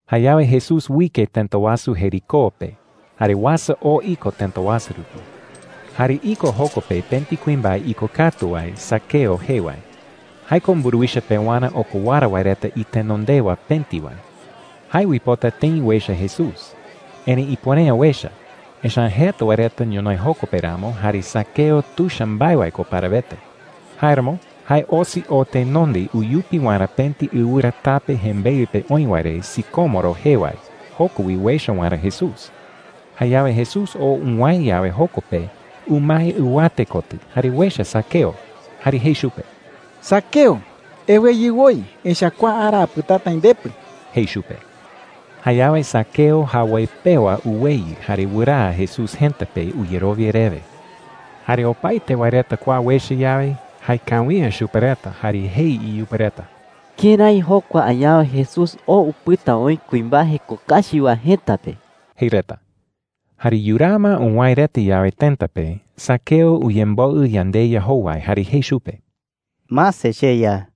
Jayawe Jesús uike tëta wasu Jericó pe jare uasa oo iko tëta wasu rupi. Jare iko joko pe pëti kuimbae ikokatu wae Zaqueo jee wae. Jae ko mburuwicha pewarä okowara wae reta itenondewa pëti wae. Jae uipota tëi uecha Jesús. Erëi ipuere’ä uecha, echa’ä jeta wae reta ñonoï joko pe ramo, jare Zaqueo tuicha mbae wae ko parawete. Jáeramo jae osi oo tenonde uyupi waerä pëti ɨwɨra tape jembeɨ pe oï wae re sicómoro jee wae, joko wi uecha waerä Jesús. Jayawe Jesús oo uwäe yawe joko pe, umae ɨwate kotɨ jare uecha Zaqueo. Jare jei chupe: “Zaqueo, eweyɨ woi. Echa’ä kua ara apɨtata aï ndepɨ,” jei chupe. Jayawe Zaqueo jawoi pewa uweyɨ jare wɨraa Jesús jëta pe uyerowia rewe. Jare opaete wae reta kua uecha yawe, jaekawi’ä chupe reta jare jei iyupe reta: “¿Kërái jokua añawe Jesús oo upɨta oï kuimbae jeko kachi wae jëta pe?” jei reta. Jare yuraa ma uwäe reta yawe tëta pe, Zaqueo uyemboɨ yandeYa jowai jare jei chupe: “Mase, cheYa,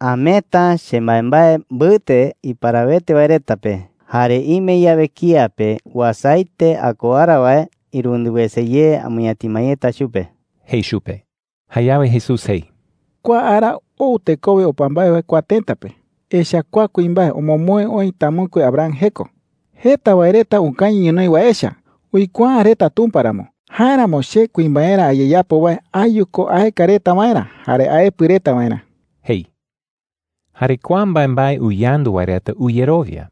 ameeta chembaembae mbɨte iparawete wae reta pe. Jare ime yawe kía pe uasaete akowara wae, irundɨ wese ye amɨñatima yeta chupe,” jei chupe. Jayawe Jesús jei: “Kua ara ou tekowe opa mbae wae kua tëta pe. Echa’ä kua kuimbae omomoe oï tamɨkue Abraham jeko,” jei. “Jeta wae reta ukañɨ ñonoï wae echa uikuaa’ä reta Tumpa ramo. Jáeramo che kuimbaerä ayeyapo wae ayu ko aeka reta waerä jare aepɨ reta waerä,” jei. Jare kua mbaembae uyandu wae reta uyerowia.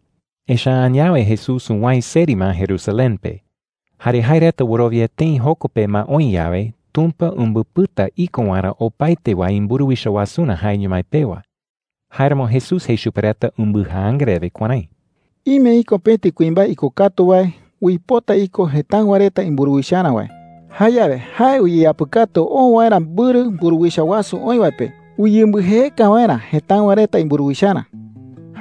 Echa’ä añawe Jesús uwäe seri ma Jerusalén pe. Jare jae reta wɨrowia tëi joko pe ma oï yawe, Tumpa umbɨpɨta iko waerä opaete wae imburuwicha wasurä jaeño mái pewa. Jáeramo Jesús jei chupe reta umbɨjaanga rewe kuärái: “Ime iko pëti kuimbae ikokatu wae uipota iko jëtáɨwa reta imburuwicharä wae. Jayawe jae uyeyapɨkatu oo waerä mbɨrɨ mburuwicha wasu oï wae pe uyembɨjeeka waerä jëtáɨwa reta imburuwicharä,” jei.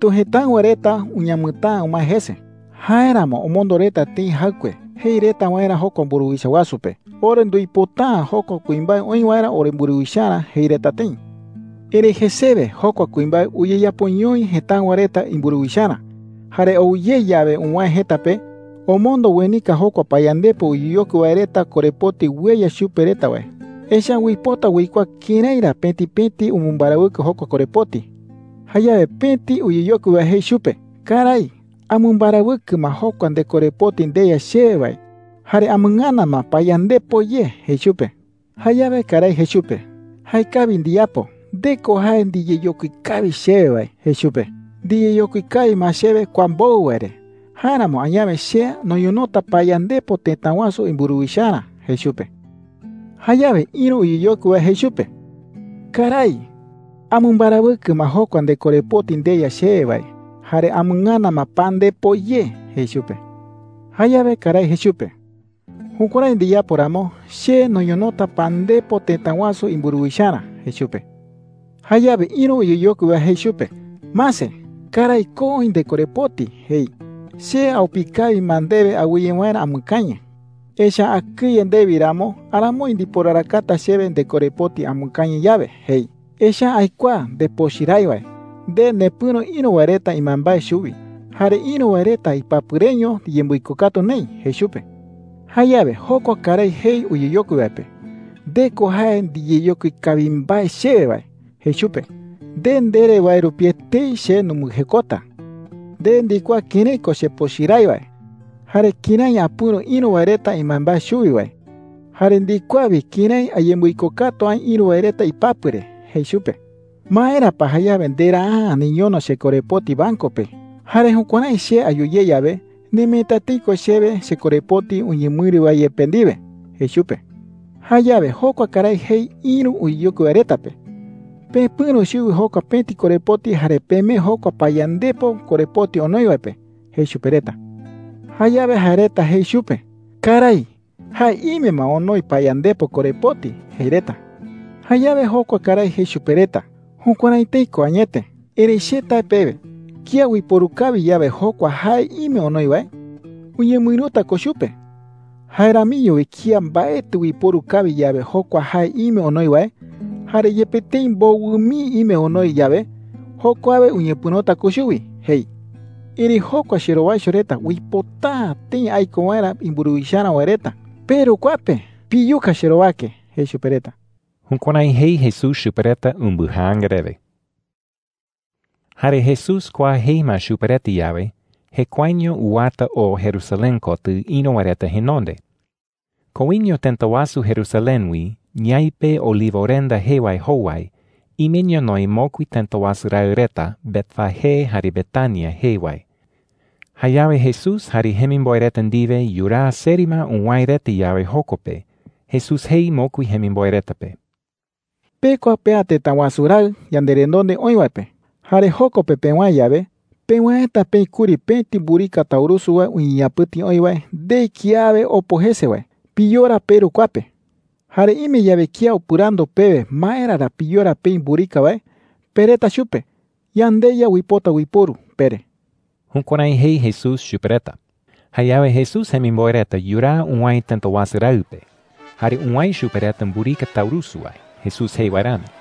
“Erëitu jëtáɨwa reta uñamɨtäa umae jese. Jáeramo omondo reta tëi jaɨkue jei reta waerä jokua mburuwicha wasu pe: ‘Ore nduipota’ä jokua kuimbae oï waerä oremburuwicharä,’ jei reta tëi. “Erëi jesewe jokua kuimbae uyeyapoñoi jëtáɨwa reta imburuwicharä. Jare ou ye yawe uwäe jëta pe, omondo uenika jokua payandepo uyeyokui wae reta korepoti ueya chupe reta wae. Echa’ä uipota uikuaa kërái ra pëti pëti umɨmbarawɨkɨ jokua korepoti,” jei. “Jayawe pëti uyeyokui wae jei chupe: ‘Karái, amɨmbarawɨkɨ ma jokua ndekorepoti ndeya chewe wae jare amɨngana ma payandepo ye,’ jei chupe. “Jayawe karái jei chupe: ‘Jaekawi ndiyapo. Nde ko jae ndiyeyokui kawi chewe wae,’ jei chupe. ‘Ndiyeyokui kawi ma chewe kua mbowɨ wae re. Jáeramo añawe che noñonota payandepo tëta wasu imburuwicharä,’ jei chupe. “Jayawe ïru uyeyokui wae jei chupe: ‘Karái, amɨmbarawɨkɨ ma jokua ndekorepoti ndeya chewe wae jare amɨngana ma pandepo ye,’ jei chupe. “Jayawe karái jei chupe: ‘Jukuärái ndiyapo ramo, che noñonota pandepo tëta wasu imburuwicharä,’ jei chupe. “Jayawe ïru uyeyokui wae jei chupe: ‘Mase, karái, ko oï ndekorepoti,’ jei. ‘Che aupi kawi ma ndewe awɨye waerä amɨkañɨ. Echa’ä akɨye ndewi ramo aramoi ndiporarakata chewe ndekorepoti amɨkañɨ yawe,’ jei. ‘Echa’ä aikuaa ndepochɨ rái wae. Nde nepɨ̈ro ïru wae reta imbaembae chuwi, jare ïru wae reta ipapɨ reño ndiyembɨikokatu neï,’ jei chupe. “Jayawe jokua karái jei uyeyokui wae pe: ‘Nde ko jae ndiyeyokui kawi mbae chewe wae,’ jei chupe. ‘Nde ndere wae rupi etei che numbɨjekota. Nde ndikuaa kërái ko chepochɨ rái wae jare kërái apɨ̈ro ïru wae reta imbaembae chuwi wae. Jare ndikuaa wi kërái ayembɨikokatu aï ïru wae reta ipapɨ re,’ jei chupe. “¿Maera pa jayawe nderaa’ä niñono chekorepoti banco pe? Jare jukuärái che ayu ye yawe, nemeeta tëi ko chewe chekorepoti uñemɨïru wae yepe ndiwe,’ jei chupe. “Jayawe jokua karái jei ïru uyeyokui wae reta pe: ‘Pepɨ̈ro chuwi jokua pëti korepoti jare pemee jokua payandepo korepoti onoi wae pe,’ jei chupe reta. “Jayawe jae reta jei chupe: ‘Karái, jae ime ma onoi payandepo korepoti,’ jei reta. “Jayawe jokua karái jei chupe reta: ‘Jukuärái tëi ko. Erëi che tae pewe, kía uiporu kawi yawe jokua jae ime onoi wae, uñemɨïruta ko chupe. Jae ramiño wi kía mbaetɨ uiporu kawi yawe jokua jae ime onoi wae, jare yepe tëi mbowɨ mii ime onoi yawe, jokuawe uñepɨ̈rota ko chuwi,’ jei. ‘Erëi jokua cherowaicho reta uipota’ä tëi aiko waerä imburuwicharä wae reta, peru kua pe piyuka cherowake,’ jei chupe reta.” Jukuärái jei Jesús chupe reta umbɨjaanga rewe. Jare Jesús kua jei ma chupe reta yawe, jekuaeño uwata oo Jerusalén kotɨ ïru wae reta jenonde. Koiño tëta wasu Jerusalén wi, ñaipe Olivorenda jee wae jowai, ime ñonoï mokui tëta wasu raɨ reta Betfagé jare Betania jee wae. Jayawe Jesús jare jemimboe reta ndiwe yuraa seri ma uwäe reta yawe joko pe, Jesús jei mokui jemimboe reta pe: “Pekua pea tëta wasu raɨ yanderenonde oï wae pe. Jare joko pe pewäe yawe, pewäeta peï kuri pëti mburika taurusu wae uñeñapɨ̈ti oï wae, ndei kiawe opo jese wae. Piyora peru kua pe,” jei chupe reta. “Jare ime yawe kía upɨrandu pewe maera ra piyora peï mburika wae, pereta chupe: ‘YandeYa uipota uiporu,’ pere.” Jukuärái jei Jesús chupe reta. Jayawe Jesús jemimboe reta yuraa uwäe tëta wasu raɨ pe, jare uwäe chupe reta mburika taurusu wae Jesús jei wae rami.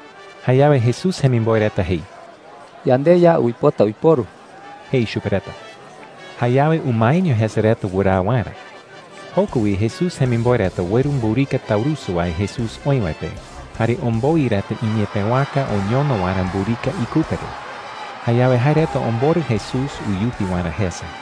Jayawe Jesús jemimboe reta jei: “YandeYa uipota uiporu,” jei chupe reta. Jayawe umaeño jese reta wɨraa waerä. Joko wi Jesús jemimboe reta ueru mburika taurusu wae Jesús oï wae pe jare omboi reta iñepëwaka oñono waerä mburika ikupe re. Jayawe jae reta omborɨ Jesús uyupi waerä jese.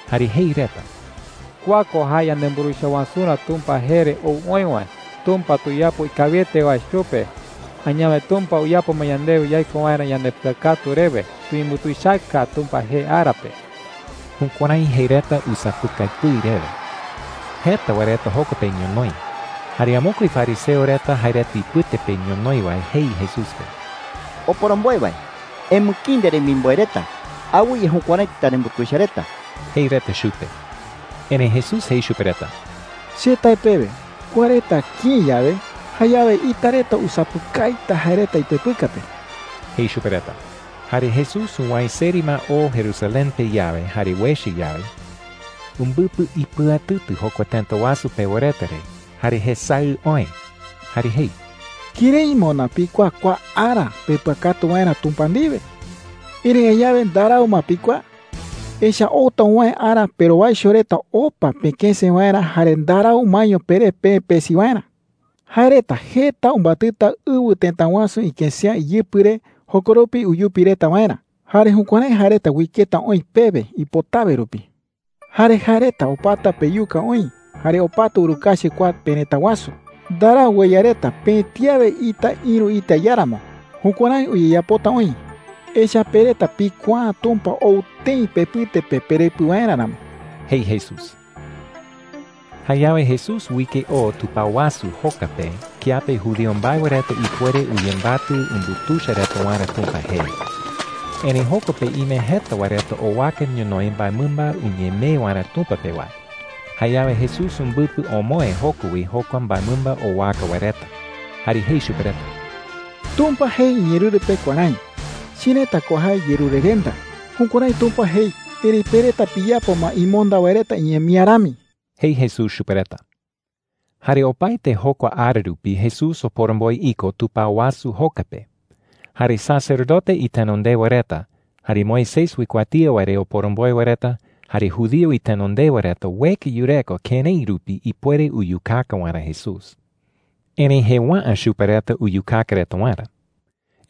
Jare jei reta: “¡Kua ko jae yanemburuwicha wasurä Tumpa jee re ou oï wae! ¡Tumpa tuyapo ikawiete wae chupe! ¡Añawe Tumpa uyapo ma yandewe yaiko waerä yandepɨakatu rewe! ¡Tuyembutuichaka Tumpa jee ara pe!” Jukuärái jei reta usapɨkai pɨi rewe. Jeta wae reta joko pe ñonoï. Jare amokue fariseo reta jae reta ipɨte pe ñonoï wae jei Jesús pe: “Oporomboe wae, emɨkïi nderemimboe reta. Awɨye jukuärái tanembutuicha reta,” jei reta chupe. Erëi Jesús jei chupe reta: “Che tae pewe, kua reta kïi yawe, jayawe ita reta usapɨkaita jae reta ipepɨka pe,” jei chupe reta. Jare Jesús uwäe seri ma oo Jerusalén pe yawe jare uecha yawe, umbɨpɨ ipɨatɨtɨ jokua tëta wasu pewa reta re jare jesaɨ oë. Jare jei: “¡Kërái moná pikuaa kua ara pepɨakatu waerä Tumpa ndiwe! Erëi añawe ndarau ma pikuaa,” jei. “Echa’ä outa uwäe ara perowaicho reta opa pekëse waerä jare ndarau umaeño peré peë pesi waerä,” jei. “Jae reta jeta umbatɨta ɨwɨ tëta wasu ikësea iyɨpɨ re jokoropi uyupi reta waerä. Jare jukuärái jae reta uiketa oï pewe ipotawe rupi,” jei. “Jare jae reta opata peyuka oï jare opata urukachi kua perëta wasu. Ndarau ueya reta pëti awe ita ïru ita iáramo. Jukuärái uyeyapota oï, echa’ä pe reta pikuaa’ä Tumpa ou tëi pepɨte pe perepɨ waerä ramo,” jei Jesús. Jayawe Jesús uike oo tupao wasu joka pe kiape judío mbae wae reta ipuere uyembatɨ umbutuicha reta waerä Tumpa jee. Erëi joko pe ime jeta wae reta owaka ñonoï mbaemɨmba uñemee waerä Tumpa pe wae. Jayawe Jesús umbɨpɨ omoë joko wi jokua mbaemɨmba owaka wae reta. Jare jei chupe reta: “Tumpa jei iñeerɨru pe kuärái: ‘Cherëta ko jae yerurerenda.’ Jukuärái Tumpa jei. Erëi pe reta piyapo ma imonda wae reta iñemía rami,” jei Jesús chupe reta. Jare opaete jokua ara rupi Jesús oporomboe iko tupao wasu joka pe. Jare sacerdote itenondewa reta, jare Moisés uikuatía wae re oporomboe wae reta, jare judío itenondewa reta ueka yureko kërái rupi ipuere uyukaka waerä Jesús. Erëi jëwa’ä chupe reta uyukaka reta waerä.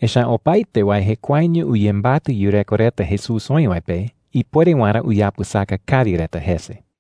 Echa’ä opaete wae jekuaeño uyembatɨ yureko reta Jesús oï wae pe ipuere waerä uyapɨsaka kawi reta jese.